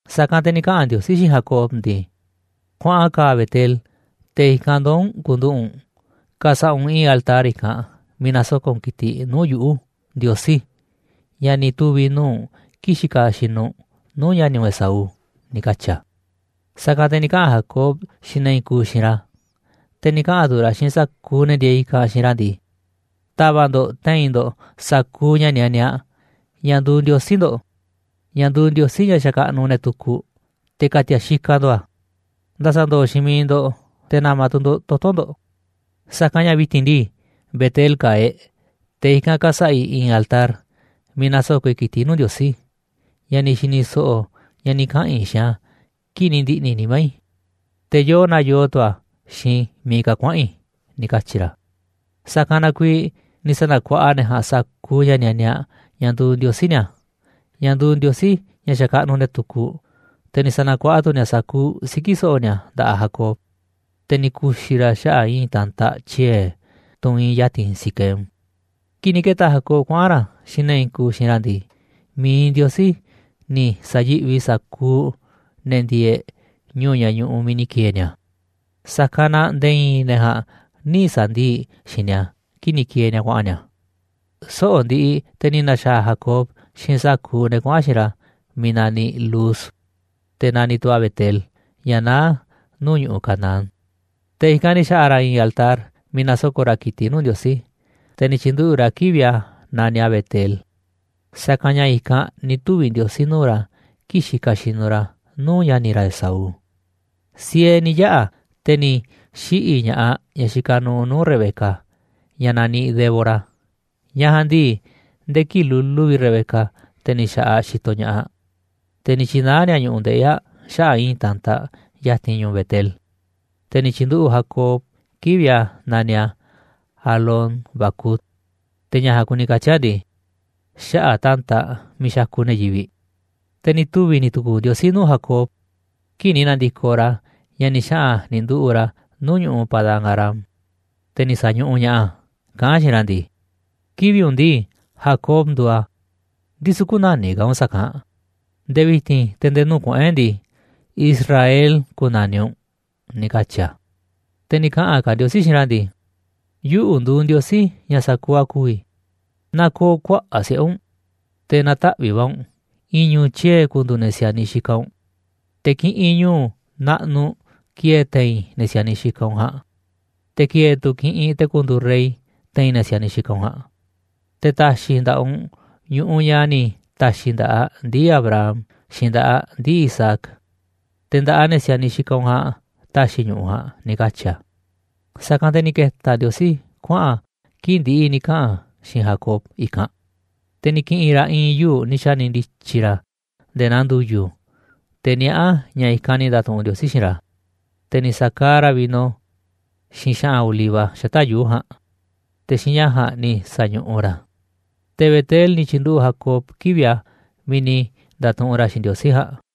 Sa̱kanꞌ te̱ ni̱ kaꞌa̱n Ndiosí xiinꞌ Jacob ndii: ―Kuaꞌan ka̱a̱ Betel, te̱ i̱kanꞌ ndoo̱ u̱nꞌ ku̱nduꞌu̱ꞌ u̱nꞌ. Ka̱sa̱ꞌa̱ u̱nꞌ i̱i̱n altar i̱kanꞌ miiꞌ na̱soko̱ꞌ u̱nꞌ ki̱tiꞌ nuu̱ꞌ yuꞌu̱, Ndiosí, ña̱ ni̱ tuvi̱ nuu̱ꞌ u̱nꞌ kii̱ꞌ xikaꞌ xinuꞌ u̱nꞌ nuu̱ꞌ ña̱ni̱ u̱nꞌ Esaú ―ni̱ katyi̱ a̱. Sa̱kanꞌ te̱ ni̱ kaꞌa̱n Jacob xiinꞌ ne̱ i̱i̱n kuuꞌ xiinꞌ ra̱, te̱ ni̱ kaꞌa̱n tu̱ ra̱ xiinꞌ sa̱kuuꞌ ne̱ ndieeꞌ i̱kanꞌ xiinꞌ ra̱ ndii: ―Ta̱va̱ꞌ ndo̱ꞌ te̱i̱n ndo̱ꞌ sa̱kuuꞌ ña̱ nianiaꞌ, ña̱ nduuꞌ ndiosí ndo̱ꞌ, ña̱ nduuꞌ ndiosí ña̱ xakaꞌnuꞌ ne̱ tukuꞌ, te̱ ka̱ti̱a̱ xikaꞌ ndo̱ꞌ a̱, nda̱sa̱ndo̱o̱ xiinꞌ miiꞌ ndo̱ꞌ, te̱ na̱ma̱ tu̱ ndo̱ꞌ toto̱ ndo̱ꞌ. Sa̱kanꞌ ña̱ vi̱ti̱n ndii, Betel ka̱a̱ e̱ꞌ, te̱ i̱kanꞌ ka̱sa̱ꞌa̱ i̱ i̱i̱n altar miiꞌ na̱soko̱ꞌ i̱ ki̱tiꞌ nuu̱ꞌ Ndiosí, ña̱ ni̱ xi̱ni̱ so̱ꞌo̱ ña̱ ni̱ kaꞌa̱n i̱ xiinꞌ a̱ kii̱ꞌ ni̱ ndi̱ꞌni̱ nimá i̱, te̱ yoo naa yoo tu̱ a̱ xiinꞌ miiꞌ ka̱ kuaꞌa̱n i̱ ―ni̱ katyi̱ ra̱. Sa̱kanꞌ na kuiiꞌ ni̱ sa̱na̱kuaꞌa ne̱ ja̱a̱nꞌ sa̱kuuꞌ ña̱ nianiaꞌ, ña̱ nduuꞌ ndiosí ni̱a̱, ña̱ nduuꞌ ndiosí ña̱ xakaꞌnuꞌ ne̱ tukuꞌ, te̱ ni̱ sa̱na̱kuaꞌa tu̱ ni̱a̱ sa̱kuuꞌ siki̱ so̱ꞌo̱ ni̱a̱ nda̱ꞌaꞌ Jacob, te̱ ni̱ ku̱xi̱ ra̱ a̱ xaꞌa̱ꞌ i̱i̱n ta̱ntaꞌ tyie̱, tunꞌ iinꞌ ya̱ti̱n Siquem. Kii̱ꞌ ni̱ ke̱ta̱ Jacob kuaꞌa̱n ra̱ xiinꞌ ne̱ i̱i̱n kuuꞌ xiinꞌ ra̱ ndii, mi̱iꞌ Ndiosí ni̱ sa̱yi̱ꞌvi sa̱kuuꞌ ne̱ ndieeꞌ ñu̱u̱ ña̱ ñu̱ꞌu̱ miiꞌ ni̱ ki̱e̱e̱ ni̱a̱, sa̱kanꞌ na nde̱e̱ i̱i̱n ne̱ ja̱a̱nꞌ nï̱ sa̱ndii̱ꞌ xiinꞌ ni̱a̱ kii̱ꞌ ni̱ ki̱e̱e̱ ni̱a̱ kuaꞌa̱n ni̱a̱. Soꞌo̱ꞌ ndiꞌiꞌ te̱ ni̱ na̱xa̱a̱ Jacob xiinꞌ sa̱kuuꞌ ne̱ kuaꞌa̱n xiinꞌ ra̱ miiꞌ naniꞌ Luz, te̱ naniꞌ tu̱ a̱ Betel, ña̱ naá nuu̱ꞌ ñu̱ꞌuꞌ Canaán Te̱ i̱kanꞌ ni̱ xa̱ꞌa̱ ra̱ i̱i̱n altar miiꞌ na̱soko̱ꞌ ra̱ ki̱tiꞌ nuu̱ꞌ Ndiosí, te̱ ni̱ tyi̱nduꞌu̱ꞌ ra̱ kivi̱ꞌ a̱ naniꞌ a̱ Betel, sa̱kanꞌ ña̱ i̱kanꞌ ni̱ tuvi̱ Ndiosí nuu̱ꞌ ra̱ kii̱ꞌ xikaꞌ xinuꞌ ra̱ nuu̱ꞌ ña̱ni̱ ra̱ Esaú. Siee ni̱ yaꞌa̱ te̱ ni̱ xiꞌi̱ ña̱ꞌaꞌ ñaꞌ ni̱ xika̱ nu̱u̱ nuu̱ꞌ Rebeca, ñaꞌ naniꞌ Débora, ñaꞌ ja̱a̱nꞌ ndii, nde̱e̱ kii̱ꞌ lulu vi̱ꞌ Rebeca, te̱ ni̱ xa̱ꞌaꞌ aꞌ xitoꞌ ña̱ꞌaꞌ aꞌ. Te̱ ni̱ tyi̱naá ni̱a̱ ñu̱ꞌuꞌ ndeꞌi̱ aꞌ xaꞌa̱ꞌ i̱i̱n ta̱ntaꞌ ya̱ti̱n ñu̱u̱ Betel, te̱ ni̱ tyi̱nduꞌu̱ꞌ Jacob kivi̱ꞌ a̱ naniꞌ a̱ Alón-bacut, te̱ ña̱ ja̱a̱nꞌ kuni katyi̱ a̱ ndii: “Xaꞌa̱ꞌ ta̱ntaꞌ miiꞌ xakuꞌ ne̱ yivi̱ꞌ.” Te̱ ni̱ tuvi̱ ni̱ tu̱ku̱u̱ Ndiosí nuu̱ꞌ Jacob, kii̱ꞌ ni̱ na̱ndi̱koꞌ ra̱ ña̱ ni̱ xaꞌa̱n ni̱ nduꞌu̱ꞌ ra̱ nuu̱ꞌ ñu̱ꞌuꞌ Padán-arám, te̱ ni̱ sa̱ñuꞌuꞌ ña̱ꞌaꞌ a̱ kaꞌán a̱ xiinꞌ ra̱ ndii: ―Kivi̱ꞌ u̱nꞌ ndii, Jacob nduuꞌ a̱, ndisu̱ kü̱na̱niꞌ ka̱ u̱nꞌ sa̱kanꞌ, nde̱e̱ vi̱ti̱n te̱ nde̱e̱ nuu̱ꞌ kuꞌu̱n e̱ꞌ ndii, Israel ku̱na̱niꞌ u̱nꞌ ―ni̱ katyi̱ a̱. Te̱ ni̱ kaꞌa̱n ka̱ Ndiosí xiinꞌ ra̱ ndii: ―Yuꞌu̱ nduuꞌ Ndiosí, ña̱ sa̱kuuꞌ a̱ ku̱vi̱, na ko̱o̱ kuaꞌa̱ꞌ siꞌe̱ u̱nꞌ, te̱ na̱taꞌvi̱ꞌ va̱ u̱nꞌ. I̱i̱n ñu̱u̱ tyie̱ ku̱ndu̱u̱ ne̱ si̱a̱niꞌ xikaꞌ u̱nꞌ, te̱ kiꞌinꞌ ñu̱u̱ naꞌnuꞌ ki̱e̱e̱ te̱i̱n ne̱ si̱a̱niꞌ xikaꞌ u̱nꞌ ja̱a̱nꞌ, te̱ ki̱e̱e̱ tu̱ kiꞌinꞌ te̱ ku̱ndu̱u̱ rey te̱i̱n ne̱ si̱a̱niꞌ xikaꞌ u̱nꞌ ja̱a̱nꞌ. Te̱ ta̱xi̱ i̱ nda̱ꞌaꞌ u̱nꞌ ñu̱ꞌuꞌ ña̱ xa̱ ni̱ ta̱xi̱ i̱ nda̱ꞌaꞌ ndii̱ Abraham, xiinꞌ nda̱ꞌaꞌ ndii̱ Isaac, te̱ nda̱ꞌaꞌ ne̱ si̱a̱niꞌ xikaꞌ u̱nꞌ ja̱a̱nꞌ ta̱xi̱ i̱ ñu̱ꞌuꞌ ja̱a̱nꞌ ―ni̱ katyi̱ a̱. Sa̱kanꞌ te̱ ni̱ ke̱ta̱ Ndiosí kuaꞌa̱n a̱ kii̱ꞌ ndi̱ꞌi̱ ni̱ kaꞌa̱n a̱ xiinꞌ Jacob i̱kanꞌ. Te̱ ni̱ ki̱ꞌi̱n ra̱ i̱i̱n yuu̱ꞌ ni̱ xa̱ni̱ ndi̱tyi̱ ra̱ nde̱e̱ naa ndu̱yu̱, te̱ niaꞌá a̱ ña̱ i̱kanꞌ ni̱ nda̱tuꞌunꞌ Ndiosí xiinꞌ ra̱, te̱ ni̱ sa̱kaaꞌ ra̱ vino, xiinꞌ xa̱ꞌa̱n oliva xata̱ꞌ yuu̱ꞌ ja̱a̱nꞌ, te̱ xiinꞌ ña̱ ja̱a̱nꞌ ni̱ sa̱ñuꞌuꞌ ra̱ a̱. Te̱ Betel ni̱ tyi̱nduꞌu̱ꞌ Jacob kivi̱ꞌ a̱ miiꞌ ni̱ nda̱tuꞌunꞌ ra̱ xiinꞌ Ndiosí ja̱a̱nꞌ.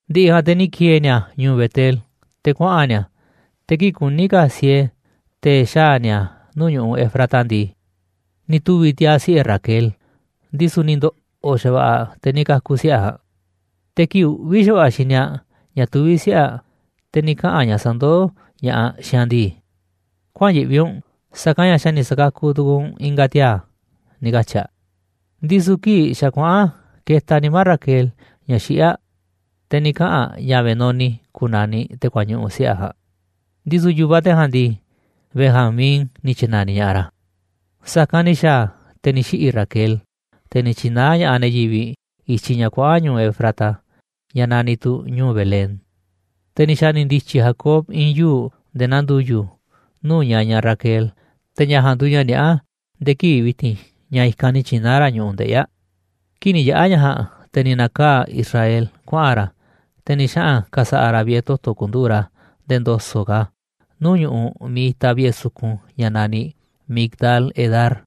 Ndi̱ꞌi̱ ja̱a̱nꞌ te̱ ni̱ ki̱e̱e̱ ni̱a̱ ñu̱u̱ Betel te̱ kuaꞌa̱n ni̱a̱, te̱ kii̱ꞌ kuní ka̱ siee te̱ xaa̱ ni̱a̱ nuu̱ꞌ ñu̱ꞌuꞌ Efrata ndii, ni̱ tuvi̱ tiaa̱ siꞌe̱ Raquel, ndisu̱ ni̱ ndo̱ꞌo̱ xa̱va̱ꞌa̱ aꞌ te̱ ni̱ ka̱ku̱ siꞌe̱ aꞌ ja̱a̱nꞌ. Te̱ kii̱ꞌ uꞌvi̱ xa̱va̱ꞌa̱ xini aꞌ ña̱ tuví siꞌe̱ aꞌ, te̱ ni̱ kaꞌa̱n ñaꞌ sandoó ña̱ꞌaꞌ xiinꞌ aꞌ ndii: ―Kuäa̱n yiꞌvi u̱nꞌ, sa̱kanꞌ ña̱ xa̱ ni̱ sa̱kakuꞌ tu̱ku̱u̱ u̱nꞌ i̱nga̱ tiaa̱ ―ni̱ katyi̱ aꞌ. Ndisu̱ kii̱ꞌ xa̱ kuaꞌa̱n ketaꞌ nimá Raquel ña̱ xiꞌí aꞌ, te̱ ni̱ kaꞌa̱n aꞌ ña̱ Benoni ku̱na̱niꞌ te̱ kuañuꞌu̱ siꞌe̱ aꞌ ja̱a̱nꞌ, ndisu̱ yu̱vaꞌ te̱ ja̱a̱nꞌ ndii, Benjamín ni̱ tyi̱na̱niꞌ ña̱ꞌaꞌ ra̱. Sa̱kanꞌ ni̱ xa̱a̱ a̱, te̱ ni̱ xiꞌi̱ Raquel, te̱ ni̱ tyi̱naá ña̱ꞌaꞌ ne̱ yivi̱ꞌ i̱tyiꞌ ña̱ kuaꞌa̱n ñu̱u̱ Efrata, ña̱ naniꞌ tu̱ ñu̱u̱ Belén. Te̱ ni̱ xa̱ni̱ ndi̱tyi̱ Jacob i̱i̱n yuu̱ꞌ nde̱e̱ naa ndu̱yu̱ nuu̱ꞌ ñañaꞌ Raquel, te̱ ña̱ ja̱a̱nꞌ nduuꞌ ña̱ niaꞌá nde̱e̱ kivi̱ꞌ vi̱ti̱n ña̱ i̱kanꞌ ni̱ tyi̱naá ra̱ ñu̱ꞌuꞌ ndeꞌi̱ aꞌ. Kii̱ꞌ ni̱ yaꞌa̱ ña̱ ja̱a̱nꞌ, te̱ ni̱ na̱kaa̱ꞌ Israel kuaꞌa̱n ra̱, te̱ ni̱ xaꞌa̱n ka̱sa̱ꞌa̱ ra̱ vi̱ꞌe̱ toto̱ ku̱nduꞌu̱ꞌ ra̱ nde̱e̱ ndo̱so̱ꞌ ka̱ nuu̱ꞌ ñu̱ꞌuꞌ miiꞌ itaꞌ vi̱ꞌe̱ sukun ña̱ naniꞌ Migdal-edar.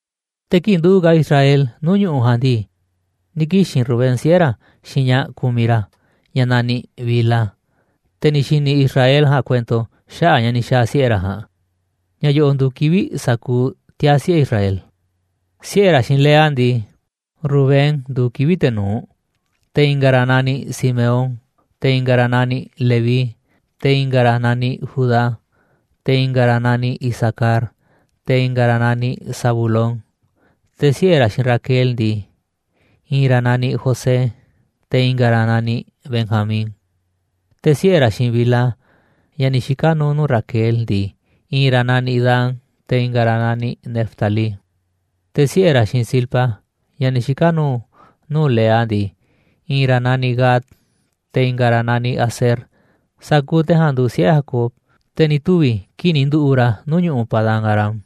Te̱ kii̱ꞌ nduꞌu̱ꞌ Israel nuu̱ꞌ ñu̱ꞌuꞌ ja̱a̱nꞌ ndii, ni̱ kixi̱n Rubén, siꞌe̱ ra̱, xiinꞌ ñaꞌ kumiꞌ ra̱, ñaꞌ naniꞌ Bilha, te̱ ni̱ xi̱ni̱ Israel ja̱a̱nꞌ kuento xaꞌa̱ꞌ ña̱ ni̱ xa̱a̱ siꞌe̱ ra̱ ja̱a̱nꞌ. Ña̱ yo̱ꞌo̱ nduuꞌ kivi̱ꞌ sa̱kuuꞌ tiaa̱ siꞌe̱ Israel: Siꞌe̱ ra̱ xiinꞌ Lea ndii, Rubén nduuꞌ kivi̱ꞌ te̱ nu̱uꞌ, te̱ i̱nga̱ ra̱ naniꞌ Simeón, te̱ i̱nga̱ ra̱ naniꞌ Leví, te̱ i̱nga̱ ra̱ naniꞌ Judá, te̱ i̱nga̱ ra̱ naniꞌ Isacar, te̱ i̱nga̱ ra̱ naniꞌ Zabulón. Te̱ siꞌe̱ ra̱ xiinꞌ Raquel ndii, i̱i̱n ra̱ naniꞌ José, te̱ i̱nga̱ ra̱ naniꞌ Benjamín. Te̱ siꞌe̱ ra̱ xiinꞌ Bilha, ñaꞌ ni̱ xika̱ nu̱u̱ nuu̱ꞌ Raquel ndii, i̱i̱n ra̱ naniꞌ Dan, te̱ i̱nga̱ ra̱ naniꞌ Neftalí. Te̱ siꞌe̱ ra̱ xiinꞌ Zilpa, ñaꞌ ni̱ xika̱ nu̱u̱ nuu̱ꞌ Lea ndii, i̱i̱n ra̱ naniꞌ Gad, te̱ i̱nga̱ ra̱ naniꞌ Aser. Sa̱kuuꞌ te̱ ja̱a̱nꞌ nduuꞌ siꞌe̱ Jacob, te̱ ni̱ tuvi̱ kii̱ꞌ ni̱ nduꞌu̱ꞌ ra̱ nuu̱ꞌ ñu̱ꞌuꞌ Padán-arám.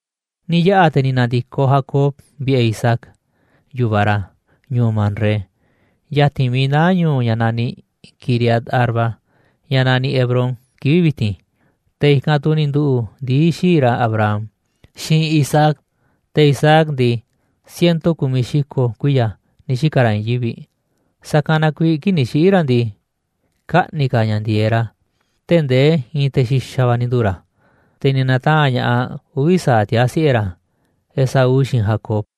Ni̱ yaꞌa̱ te̱ ni̱ na̱ndi̱koꞌ Jacob vi̱ꞌe̱ Isaac, yu̱vaꞌ ra̱, ñu̱u̱ Mamré, ya̱ti̱n miiꞌ naá ñu̱u̱ ña̱ ni̱ naniꞌ Quiriat Arba, ña̱ naniꞌ Hebrón kivi̱ꞌ vi̱ti̱n. Te̱ i̱kanꞌ tu̱ ni̱ nduꞌu̱ꞌ ndii̱ xii̱ꞌ ra̱ Abraham, xiinꞌ ndii̱ Isaac ja̱a̱nꞌ. Te̱ Isaac ndii, ciento ku̱miꞌ xi̱ko̱ kuiya̱ ni̱ xika̱ ra̱ i̱i̱n yivi̱ꞌ. Sa̱kanꞌ na kuiiꞌ kii̱ꞌ ni̱ xiꞌi̱ ra̱ ndii, kaꞌni̱ ka̱ ña̱ ndi̱e̱e̱ꞌ ra̱ tee̱ꞌ ndee i̱i̱n te̱ xi̱xa̱ va̱ ni̱ nduu̱ ra̱, te̱ ni̱ na̱taa̱nꞌ ña̱ꞌaꞌ uvi̱ sa̱aꞌ tiaa̱ siꞌe̱ ra̱, Esaú xiinꞌ Jacob.